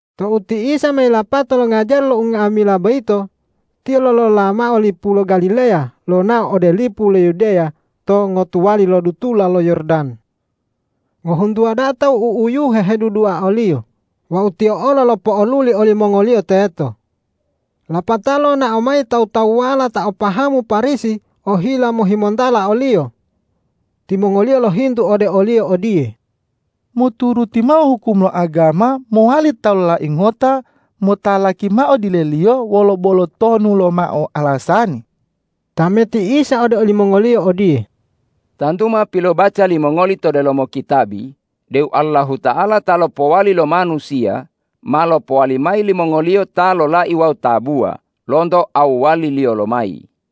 Tou ti Isa ma yilapato longajari lo unga'amila boyito, Tiyo lolola mao lipu lo Galileya lonao ode lipu lo Yudeya to ngotuwali lo dutula lo Yordan. Ngohuntuwa da'a tawu u'uyuhe hedudua o-Liyo wawu Tiyo olo lopo'oluli olimongoliyo teto. Lapatao lonao mayi tawu-tawuwala ta o pahamu Parisi ohila mohimontala o-Liyo. Timongoliyo lohintu ode o-Liyo odiye,”Moturuti mao hukum lo agama mowali ta lolai ngota motalaki mao dileliyo wolo bolo tonu lomao alasani?” Tameti Isa ode olimongoliyo odiye,”Tantu ma pilobaca limongoli to delomo kitabi deu Allahuta'ala ta lopowali lo manusiya, ma lopowali mayi limongoliyo ta lolai wawu tabuwa lonto awwaliliyo lomayi.”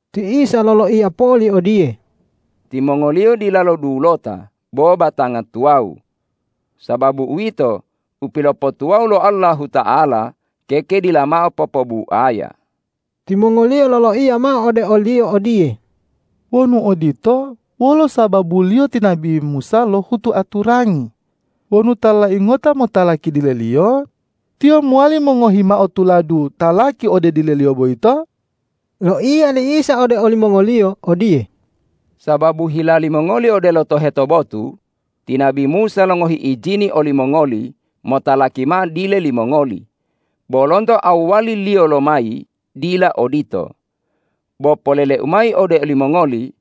Ti Isa loloiya poli odiye,”Timongoliyo dilalo dulota bo batanga tuwawu. Sababu uwito, u pilopotuwawu lo Allahuta'ala keke dila mao popobuaya.” Timongoliyo loloiya mao ode o-Liyo odiye,”Wonu odito, wolo sababuliyo ti nabi Musa lohutu aturangi wonu ta lolai ngota motalaki dileliyo, tiyo mowali mongohi mao tuladu talaki ode dileliyo boyito?” Loiya li Isa ode olimongoliyo odiye,”Sababu hila limongoli odelo toheto botu ti nabi Musa longohi ijini olimongoli motalaki mao dile limongoli. Bo lonto awwaliliyo lomayi dila odito. Bo polele-U mayi ode olimongoli: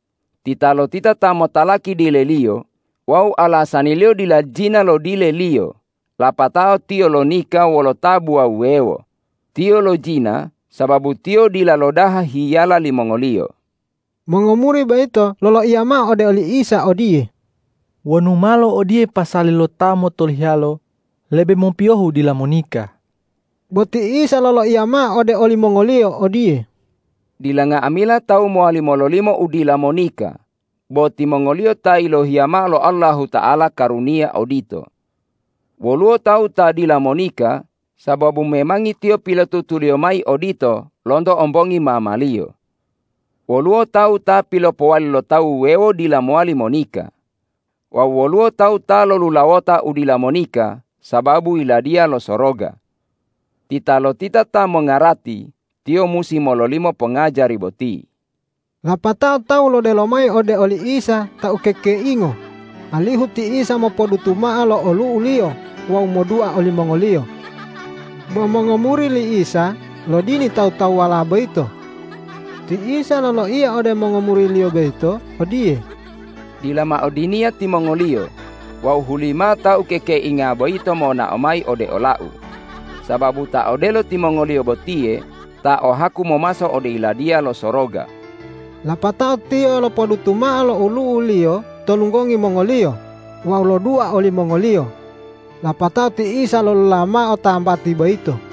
Titalotita ta motalaki dileliyo wawu alasaniliyo dila jina lo dileliyo lapatao tiyo lonika wolo tabuwa wuwewo, tiyo lojina sababu tiyo dila lodaha hiyala limongoliyo.” Mongomuri boyito loloiya mao ode oli Isa odiye,”Wonu malo odiye pasali lo ta motolohiyalo, lebe mopiyohu dila monika.” Bo ti Isa loloiya mao ode olimongoliyo odiye,”Dila nga'amila tawu mowali mololimo u dila monika, bo timongoliyo ta yilohiya mao lo Allahuta'ala karuniya odito. Woluwo tawu ta dila monika sababu memangi tiyo pilotutuliyo mayi odito lonto ombongi mamaliyo. Woluwo tawu ta pilopowali lo tawu wuwewo dila mowali monika. Wawu woluwo tawu ta lolulawota u dila monika sababu Yiladiya lo Soroga. Titalotita ta mongarati, tiyo musi mololimo pongajari boti.” Lapatao tawu lodelo mayi ode oli Isa ta ukekeingo, alihu ti Isa mopodutu mao lo olu'u-Liyo wawu modua olimongoliyo. Bo mongomuri li Isa lodini tawu-tawuwala boyito. Ti Isa loloiya ode mongomuri-Liyo boyito odiye,”Dila mao diniya timongoliyo wawu hulimao ta ukekeinga boyito monao mayi ode ola-U, sababu ta odelo timongoliyo botiye ta o haku momaso ode Yiladiya lo Soroga.” Lapatao Tiyo lopodutu mao lo olu'u-Liyo to lunggongi mongoliyo wawu lodua olimongoliyo. Lapatao ti Isa lolola mao tambati boyito.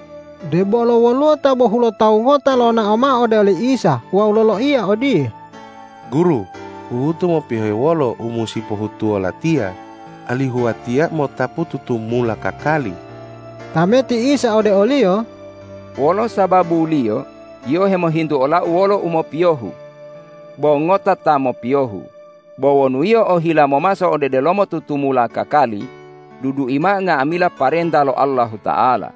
Debolo woluwo ta bohulotawu ngota lonao mao ode oli Isa wawu loloiya odiye,”Guru, huhutu mopiyohe wolo u musi pohutuwo latiya, alihu watiya mo'otapu tutumula kakali?” Tameti Isa ode oliyo,”Wolo sababuliyo yio hemohintu ola-U wolo umopiyohu? Bo ngota ta mopiyohu. Bo wonu yio ohila momaso ode delomo tutumula kakali, dudui mao nga'amila parenta lo Allahuta'ala.”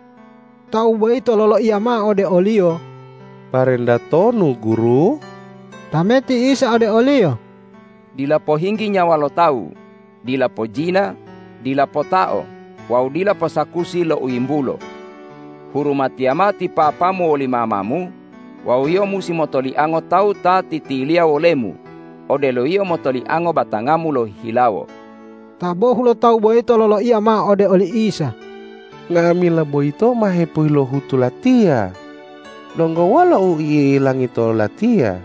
Tawu boyito loloiya mao ode o-Liyo,”Parenta tonu, Guru?” Tameti Isa ode oliyo,”Dila pohinggi nyawa lo tawu, dila pojina, dila potao wawu dila posakusi lo u yimbulo. Hurumatiya mao ti papamu woli mamamu wawu yio musi motoliango tawu ta titiliya wolemu odelo yio motoliango batangamu lohihilawo.” Ta bohulotawu boyito loloiya mao ode oli Isa,”Nga'amila boyito ma hepilohutu latiya. Donggo wolo u i'ilangi to olatiya?”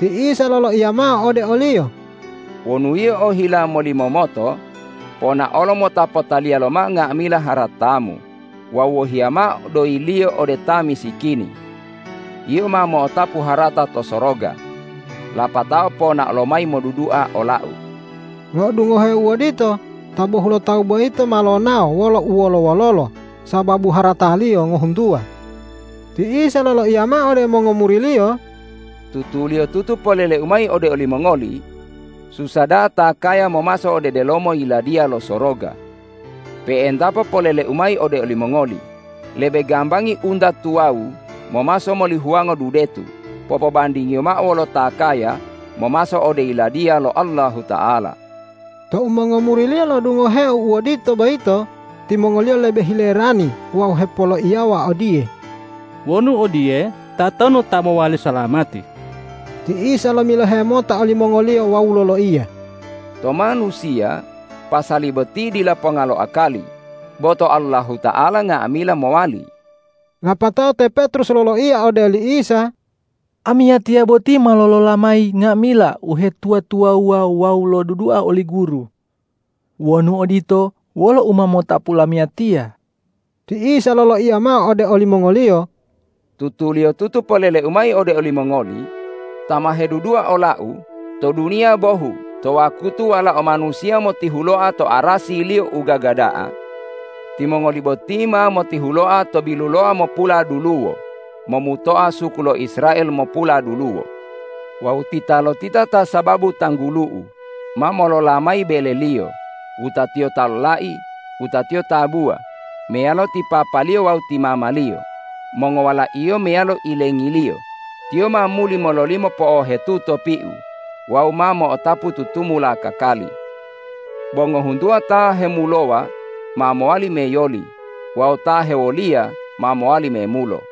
Ti Isa loloiya mao ode oliyo,”Wonu yio ohila molimomoto, ponaolo mota potaliya lomao nga'amila haratamu wawu wohiya mao doyiliyo ode ta misikini. Yio ma mo'otapu harata to soroga. Lapatao ponao lomayi modudua ola-U.” Lo'odungoheo u odito ta bohulotawu boyito ma lonao wolo uwolo-wololo sababu harataliyo ngohuntuwa. Ti Isa loloiya mao ode mongomuri-Liyo,”Tutuliyotutu polele-U mayi ode olimongoli: Susa da'a ta kaya momaso ode delomo Yiladiya lo Soroga. Pe'entapo polele-U mayi ode olimongoli: Lebe gambangi unta tuwawu momaso moli huwango dudetu popobandingiyo mao wolo ta kaya momaso ode Yiladiya lo Allahuta'ala.” Tou mongomuri-Liyo lo'odungoheo u odito boyito, timongoliyo lebe hilerani wawu hepoloiyawa odiye,”Wonu odiye, tatonu ta mowali salamati?” Ti Isa lomilohe mota olimongoliyo wawu loloiya,”To manusiya pasali boti dila ponga lo akali, bo to Allahuta'ala nga'amila mowali.” Lapatao te Petrus loloiya ode oli Isa,”Amiyatiya boti ma lolola mayi nga'amila uhetuwa-tuwawuwa wawu lodudua oli Guru. Wonu odito, wolo u ma motapu lamiyatiya?” Ti Isa loloiya mao ode olimongoliyo,”Tutuliyotutu polele-U mayi ode olimongoli: Ta ma hedudua ola-U, to duniya bohu to wakutu Walao Manusiya motihuloa to arasi-Liyo u gaga da'a, timongoli boti ma motihuloa to biluloamopula duluwo momutoa suku lo Israel mopuladuluwo! Wawu titalotita ta sababu tanggulu-U ma lolola mayi beleliyo, wutatiyo ta lolai, wutatiyo tabuwa meyalo ti papaliyo wawu ti mamaliyo, mongowalaiyo meyalo ilengiliyo, tiyo ma muli mololimo po'ohetuto piu wawu ma mo'otapu tutumula kakali. Bo ngohuntuwa ta hemulowa ma mowali meyoli wawu ta hewoliya ma mowali memulo.”